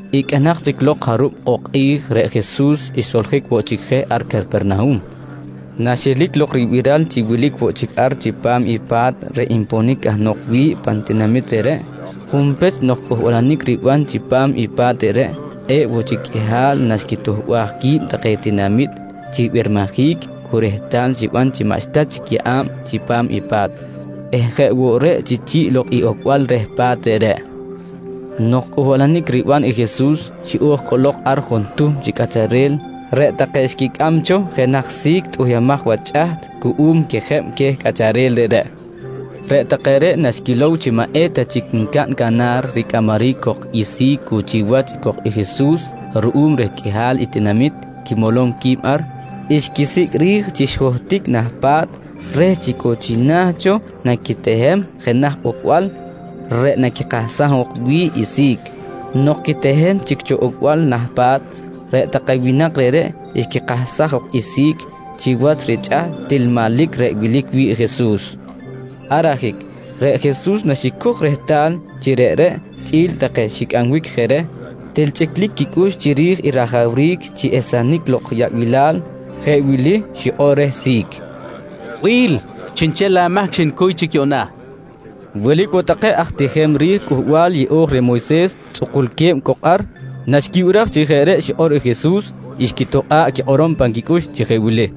Iqꞌuinak chic lok jarub ok kꞌi̱j, reꞌ Jesus xsoljic woꞌ chic je ar Capernahum. Naxelic lok ribiral chi wilic woꞌ chic ar chipam i pa̱t reꞌ nponic cahnok wi̱ꞌ pan tinamit reꞌreꞌ, junpech nok cꞌuhbalanic riban chipam i pa̱t reꞌreꞌ, kꞌe̱ꞌ woꞌ chic qꞌuihal naxquituhbaj qui̱b take tinamit chi ribirmijic cu rehtal xiban chi maꞌxta chic yeꞌa̱b chipam i pa̱t eh jeꞌ woꞌ reꞌ chi chi̱ꞌ lok i ocbal reh pa̱t reꞌreꞌ. Nok cꞌuhbalanic riban i Jesus, xiꞌo̱j cꞌolok ar juntuhm chi cꞌacharel reꞌ take xquicꞌam cho jenaj si̱c tꞌuhyumaj wach chꞌaht cuꞌum quejeb queh cꞌacharel reꞌreꞌ. Reꞌ take reꞌ naxquilow chi maꞌ eta chic ncaꞌn canar ricꞌamaric cok i si̱c cu chiwach cok i Jesus ruꞌum reh riqꞌuihal i tinamit quimolom qui̱b ar, xquisicꞌ ri̱j chi xijohtic nah pa̱t reh chi cu china̱ cho naquitehem jenaj ocbal reꞌ naquikahsam jok wi̱ꞌ i si̱c. Nok quitehem chic cho rocbal nah pa̱t, reꞌ take winak reꞌreꞌ xquikahsaj jok i si̱c wach richꞌaht til manlic reꞌ wilic wi̱ꞌ i Jesus. Ar ajic reꞌ Jesus naxicoj rehtal chi reꞌreꞌ chꞌi̱l take xicꞌambic je reh, til chꞌiclic quicꞌux chiri̱j i rajawric chi esenic lok yaꞌbilal, jeꞌ wili xikꞌor reh si̱c: «Bi̱l, chiꞌnchel amahc xnicuy chic yuꞌna, nqui reh. Wilic woꞌ take aj tijem ri̱j Cꞌuhbal Yeꞌo̱j reh Moyses tzꞌukulque̱b cok ar. Naxquibiraj chi jeꞌ reꞌ xikꞌor i Jesus, xquitokꞌa̱ꞌ quikꞌorom pan quicꞌux chi jeꞌ wili: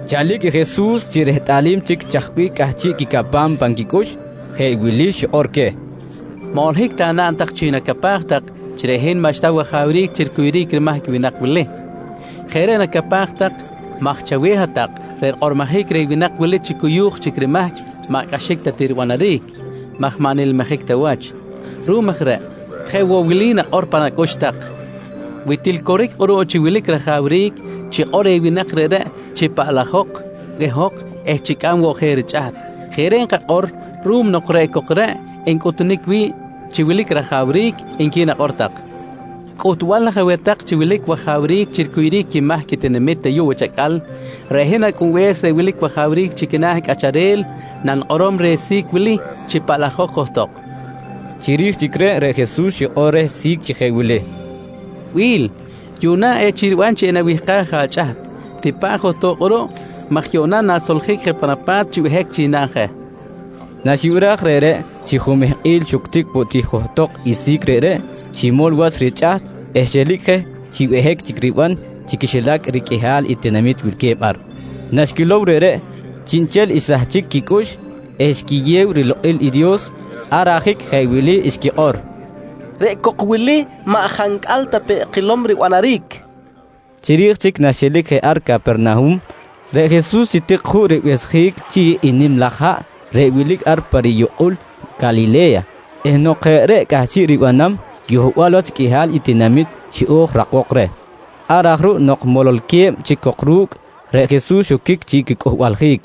Chalic i Jesus chi rehtꞌalim chic chaj bih cꞌahchiꞌ quicapam cho pan quicꞌux, jeꞌ wili xikꞌor queh: «Maꞌ holohic ta naꞌn tak chi nacapaj tak chi reꞌ hin maꞌxta wajawric chi ricuyuric rimahc i winak wili. Jeꞌ reꞌ nacapaj tak maj chaweh hat-tak reꞌ rikꞌormojic reh winak wili chi cuyu̱j chic rimahc maꞌ cꞌaxic ta ti ribanaric maj maꞌ nilmijic ta wach. Ruꞌum aj reꞌ, jeꞌ woꞌ wili nakꞌor tak cho pan acꞌux tak: ‹Wi til coric kꞌuruꞌ chi wilic rajawric, chikꞌor reh winak reꞌreꞌ chi paꞌlajok, behok eh chicꞌam woꞌ je richꞌaht. Jeꞌ reꞌ nkakꞌor ruꞌum nok reꞌ cok reꞌ ncꞌuhtunic wi̱ꞌ chi wilic rajawric, nqui nakꞌor tak. «Cꞌuhtbal aj aweh tak chi wilic wajawric chi ricuyuric quimahc i tinamit ayuꞌ wach acꞌal, reꞌ hin Acꞌunbe̱s reꞌ wilic wajawric chi quina̱ cꞌacharel nanikꞌorom reh si̱c wili chi paꞌlajok johtok, nqui queh. Chiri̱j chic reꞌ, reꞌ Jesus xikꞌor reh si̱c chi jeꞌ wili: «Bi̱l, yuꞌna echic riban chi enawihkaj je achꞌaht. Tipa̱ꞌ johtok kꞌuruꞌ maj yuꞌna na̱soljic je pan apa̱t chi behic chic naꞌn je, nqui reh. Naxibiraj reꞌreꞌ, chi jumehkꞌil xuctic woꞌ ti johtok i si̱c reꞌreꞌ, ximol wach richꞌaht eh xelic je chi behic chic riban chi quixilac i riqꞌuihal i tinamit wilque̱b ar. Naxquilow reꞌreꞌ, chiꞌnchel xsahchic quicꞌux eh xquiyew rilokꞌil i Dios. Ar ajic jeꞌ wili xquikꞌor: «Reꞌ cok wili maꞌ jancꞌal ta peꞌ kilom ribanaric, nqui take chi quiwach. Chiri̱j chic naxelic je ar Capernahum, reꞌ Jesus xitik juꞌ ribehsjic chi̱ꞌ i nim laj haꞌ reꞌ wilic ar pa riyukꞌul Calile̱ya eh nok jeꞌ reꞌ cꞌahchiꞌ ribanam, yohbal wach qꞌuihal i tinamit xiꞌo̱j rakbok reh. Ar aj ruꞌ nok mololque̱b chic cok ru̱cꞌ, reꞌ Jesus xoquic chi quicꞌuhbaljic.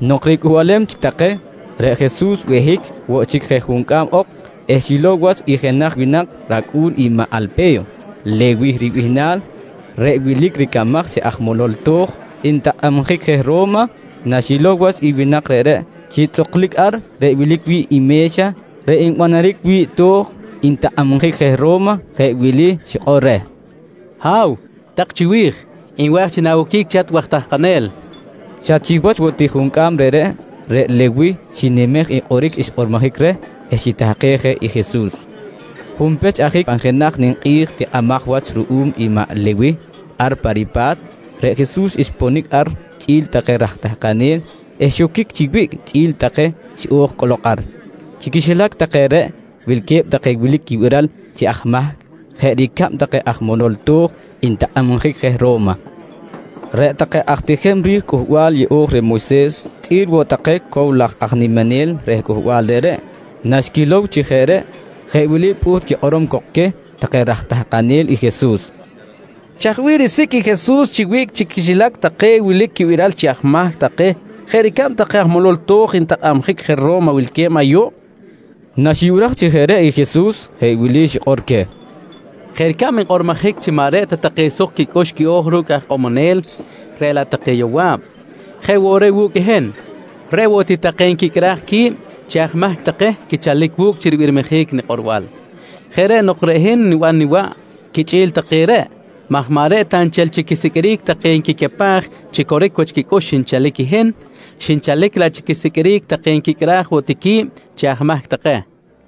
Nok ricꞌuhbalem chic take, reꞌ Jesus behic woꞌ chic je juncꞌam ok eh xilow wach i jenaj winak racꞌu̱n i maꞌ Alpe̱yo, Lewih ribihnal reꞌ wilic ricamaj chi aj molol to̱j ntakꞌabjic je Ro̱ma. Naxilow wach i winak reꞌreꞌ chi tzꞌuklic ar reꞌ wilic wi̱ꞌ i me̱xa reꞌ nbanaric wi̱ꞌ to̱j ntakꞌabjic je Ro̱ma, jeꞌ wili xikꞌor reh: «Ha̱w tak chiwi̱j, nwa̱j chi na̱woquic chi hat waj tahkanel, nqui reh. Xa chiwach woꞌ ti juncꞌam reꞌreꞌ, reꞌ Lewih xinimej i kꞌoric xkꞌormojic reh eh xitahkej je i Jesus. Junpech ajic pan jenaj ninkꞌi̱j tikꞌimaj wach ruꞌum i maꞌ Lewih ar pa ripa̱t, reꞌ Jesus xponic ar chꞌi̱l take raj tahkanel eh xoquic chi wiꞌc quichꞌi̱l take xiꞌo̱j cꞌolok ar. Chi quixilac take reꞌ wilque̱b take wilic quibiral chi aj mahc jeꞌ ricab take aj moloj to̱j ntakꞌabjic je Ro̱ma. Reꞌ take aj tijem ri̱j Cꞌuhbal Yeꞌo̱j reh Moyses chꞌi̱l woꞌ take cow laj aj niminel reh cꞌuhbal reꞌreꞌ naxquilow chi jeꞌ reꞌ, jeꞌ wili pꞌuht quikꞌorom cok queh take raj tahkanel i Jesus: «Chaj bih risicꞌ i Jesus chi wiꞌc chi quixilac take wilic quibiral chi aj mahc take jeꞌ ricab take aj molol to̱j ntakꞌabjic je Ro̱ma wilque̱b ayuꞌ? Naxibiraj chi jeꞌ reꞌ i Jesus, jeꞌ wili xikꞌor queh: «Jeꞌ ricab nkꞌormojic chi maꞌ reꞌ ta take suk quicꞌux quiꞌo̱j ru̱cꞌ aj ikꞌomonel, reꞌ laꞌ take yowa̱b, jeꞌ woꞌ reꞌ wu̱cꞌ i hin, reꞌ woꞌ ti take nquicꞌraj qui̱b chi aj mahc take quichalic wu̱cꞌ chi ribirmijic nikꞌorbal. Jeꞌ reꞌ nok reꞌ hin niban niwaꞌ quichꞌi̱l take reꞌ maj maꞌ reꞌ ta nchel chi quisiqꞌuiric take nquicapaj chi coric wach quicꞌux xinchalic i hin, xinchalic laꞌ chi quisiqꞌuiric take nquicꞌraj woꞌ ti qui̱b chi aj mahc take, nqui Jesus.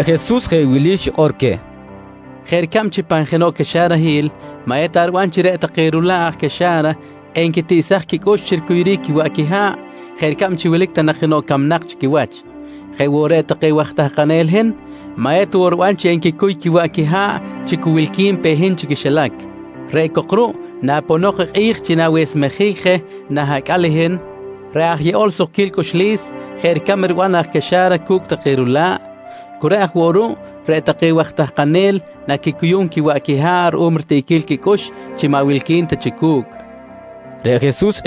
Reꞌ Jesus jeꞌ wili xikꞌor queh: «Jeꞌ ricab chi pan jenoꞌ caxarahil maꞌ eta riban chi reꞌ take rula̱ꞌ aj caxa̱ra enquitiꞌsaj quicꞌux chi ricuyuric quiwaꞌ quiha̱ꞌ jeꞌ ricab chi wilic ta nak jenoꞌ camnak chi quiwach, jeꞌ woꞌ reꞌ take waj tahkanel i hin maꞌ eta woꞌ riban chi enquicuy quiwaꞌ quiha̱ꞌ chi cu wilqui̱n pe hin chi quixilac. Reꞌ cok ruꞌ, naponok i kꞌi̱j chi na̱wesmejic je nah acꞌal i hin reꞌ aj yeꞌol sukquil cꞌuxlis jeꞌ ricab riban aj caxa̱ra cu̱cꞌ take rula̱ꞌ, cu reꞌ aj woꞌ ruꞌ reꞌ take waj tahkanel naquicuyum quiwaꞌ quiha̱ꞌ ruꞌum ritiꞌquil quicꞌux chi maꞌ wilqui̱n ta chic cu̱cꞌ, nqui Jesus.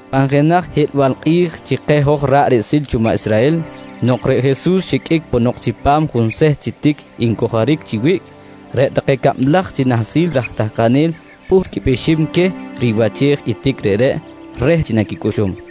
Pan jenaj hiꞌlbal kꞌi̱j chi keh hoj ra̱ꞌ riꞌsil cho maꞌ Israhel, nok reꞌ Jesus xiqꞌuic ponok chipam junseht chi tic ncojoric chi wiꞌc, reꞌ take cablaj chi nahsil raj tahkanel pꞌuht quipꞌixim queh i riwachej i tic reꞌreꞌ reh chi naquicꞌuxum.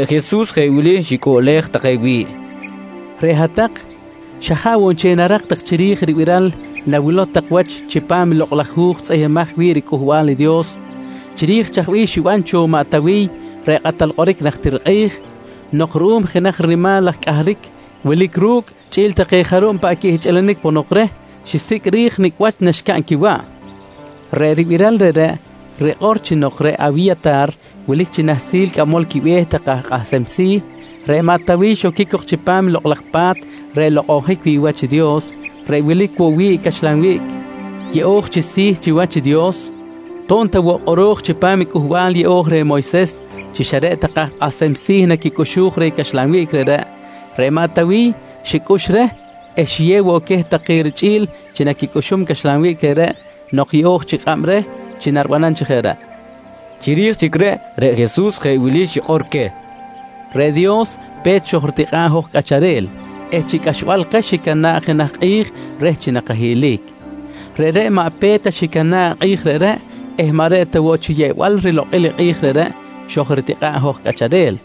Reꞌ Jesus jeꞌ wili xicꞌuꞌlej take wi̱ꞌ: «Reꞌ hat-tak xa jaꞌ woꞌ nchel narak tak chiri̱j i ribiral nawilow tak wach chipam i Lokꞌ laj Hu̱j tzꞌihmbimaj wi̱ꞌ riCꞌuhbal i Dios chiri̱j chaj bih xiban cho i maꞌ Tawiy reꞌ kꞌatal kꞌoric najtir kꞌi̱j nok ruꞌum jenaj rinimal laj cꞌahric wilic ru̱cꞌ chꞌi̱l take jarub paꞌ quihchꞌilinic ponok reh, xisicꞌ ri̱j nicꞌ wach naxcaꞌn quiwaꞌ. Reꞌ ribiral reꞌreꞌ rikꞌor chi nok reꞌ Awiya̱tar wilic chi nahsil cꞌamol quibe̱h take aj kꞌahsem si̱, reꞌ maꞌ Tawiy xoquic cok chipam i Lokꞌ laj Pa̱t reꞌ nlokꞌonjic wi̱ꞌ wach i Dios reꞌ wilic woꞌ wi̱ꞌ i caxlan wiꞌc yeꞌo̱j chi si̱ chiwach i Dios. To̱b ta woꞌ kꞌoro̱j chipam i Cꞌuhbal Yeꞌo̱j reh Moyses chi xa reꞌ take aj kꞌahsem si̱ naquicꞌuxuj reh caxlan wiꞌc reꞌreꞌ, reꞌ maꞌ Tawiy xicꞌux reh eh xiyew woꞌ queh take richꞌi̱l chi naquicꞌuxum caxlan wiꞌc reꞌreꞌ nok yeꞌo̱j chic kꞌab reh chi naribanam chi jeꞌ reꞌ, nqui queh. Chiri̱j chic reꞌ, reꞌ Jesus jeꞌ wili xikꞌor queh: «Reꞌ Dios pe̱t xojritikꞌa̱ꞌ hoj cꞌacharel eh chi cꞌaxbal keh xicana̱ꞌ jenaj kꞌi̱j reh chi nakahiꞌlic. Reꞌreꞌ maꞌ pe̱t ta xicana̱ꞌ i kꞌi̱j reꞌreꞌ eh maꞌ reꞌ ta woꞌ chi yeꞌbal rilokꞌil i kꞌi̱j reꞌreꞌ xojritikꞌa̱ꞌ i hoj cꞌacharel.